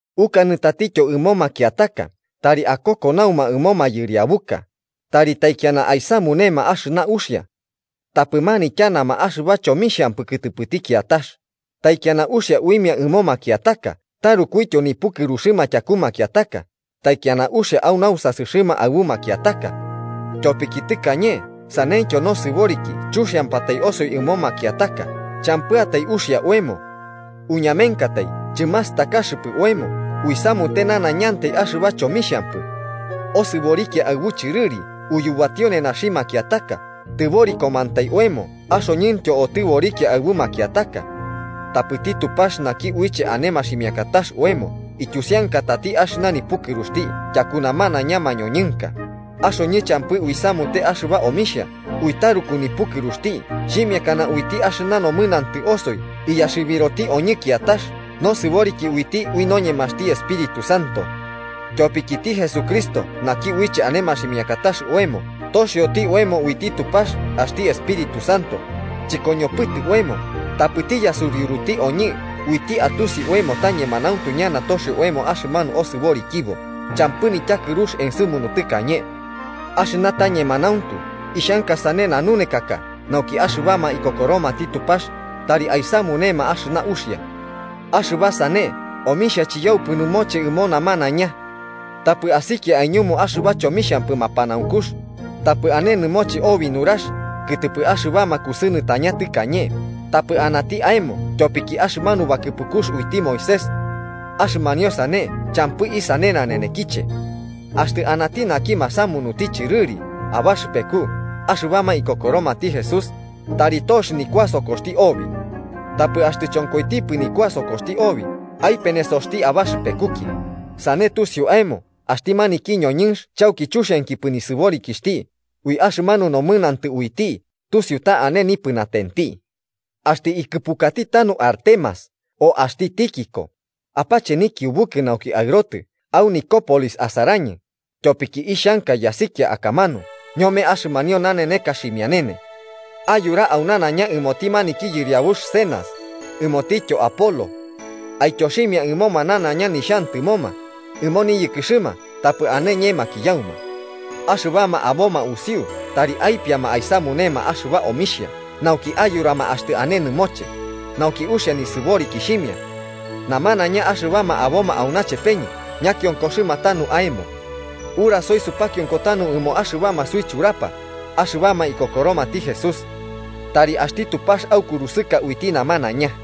Ukanɨ tatityo ɨmo makiataka tari akokonauma ɨmo mayɨriabuka, tari taikiana aisamunema axɨna uxia. Tapɨ manityanama axɨba chomixhampɨ kɨtɨpɨti kiatax, taikiana uxia uimia ɨmo makiataka tarukuityo nipukɨruxɨma tyaku makiataka, taikiana uxia au nausasɨxɨma aɨbu makiataka. Tyopiki tɨkañe saneityo nosɨboriki chuxiampatai osoi ɨmo makiataka champɨatai uxia oemo. Uñamenkatai chɨmastakaxɨpɨ oemo uisamute nanaiñantai axɨba chomixhampɨ. Osɨborikia aɨbu chɨrɨri uyubatio nenaxi makiataka, tɨborikomantai oemo axoñɨntyo otɨborikiatai aɨbu makiataka. Tapɨti Tupax naki uiche ane maximiakatax oemo ityusiankatati axɨna nipukɨruxti tyaku namanaiña mañoñɨnka, axoñɨ champɨ uisamute axɨba omixha, ui taruku nipukɨruxti xhimiakana uiti axɨna nomɨnantɨ osoi iyaxɨbiroti oñɨ kiatax nosɨboriki uiti ui noñemaxti Espíritu Santo. Tyopikiti Jesucristo naki uiche ane maximiakatax oemo toxioti oemo uiti Tupax axti Espíritu Santo, chɨkoñopɨtɨ oemo, tapɨti yasuriuruti oñɨ uiti atusi oemo ta ñemanauntu ñana toxio oemo axɨmanu osɨborikibo champɨ nityakɨrux ensɨmunu tɨkañe. Axɨna ta ñemanauntu, ixhanka sane nanunekaka nauki axɨbama ikokoromati Tupax tari aisamunema axɨna uxia. Axɨba sane omixhia chiyaupɨ nɨmoche ɨmo namanaiña. Tapɨ asikia aiñumu axɨba chomixhampɨ mapanaunkux, tapɨ ane nɨmoche obi nurax kɨtɨpɨ axɨbama kusɨnɨtaña tɨkañe, tapɨ ɨnantɨ aemo tyopiki axɨmanu bakɨpukux uiti Moisés. Axɨmanio sane champɨ isane nanenekiche. Axtɨ anati naki masamunuti chɨrɨri abaxɨpeku axɨbama ikokoromati Jesús, tari tox nikuasokoxti obi. Tapɨ axtɨ chonkoitipɨ nikuasokoxti obi, aipenesoti abaxɨpekuki, sane tusiu aemo axti maniki ñoñɨnx chauki chuxiankipɨ nisɨborikixhti ui axɨmanu nomɨnantɨ uiti tusiu ta ane nipɨnatenti. Axtɨ ikɨpukati tanu Artemas o axti Tíquico, apache nikiubukɨ nauki aɨrotɨ au Nicópolis asarañɨ, tyopiki ixhanka yasikia akamanu ñome axɨmanio naneneka ximianene. Ayura au nanaiña ɨmoti maniki yɨriabux Zenas, ɨmotityo Apolo. Aityoximia ɨmoma nanaiña nixhantɨmoma ɨmo niyɨkɨxɨma tapɨ ane ñemakiyauma. Axɨbama aboma usiu tari aipiama aisamunema axɨba omixhia nauki ayurama axtɨ ane nɨmoche, nauki uxia nisɨborikixhimia. Namanaiña axɨbama aboma auna chepeñɨ ñakionkoxɨma tanu aemo. Urasoi supakionko tanu ɨmo axɨbama suichurapa axɨbama ikokoromati Jesús. Tari axti Tupax aukurusɨka uiti namanaiña.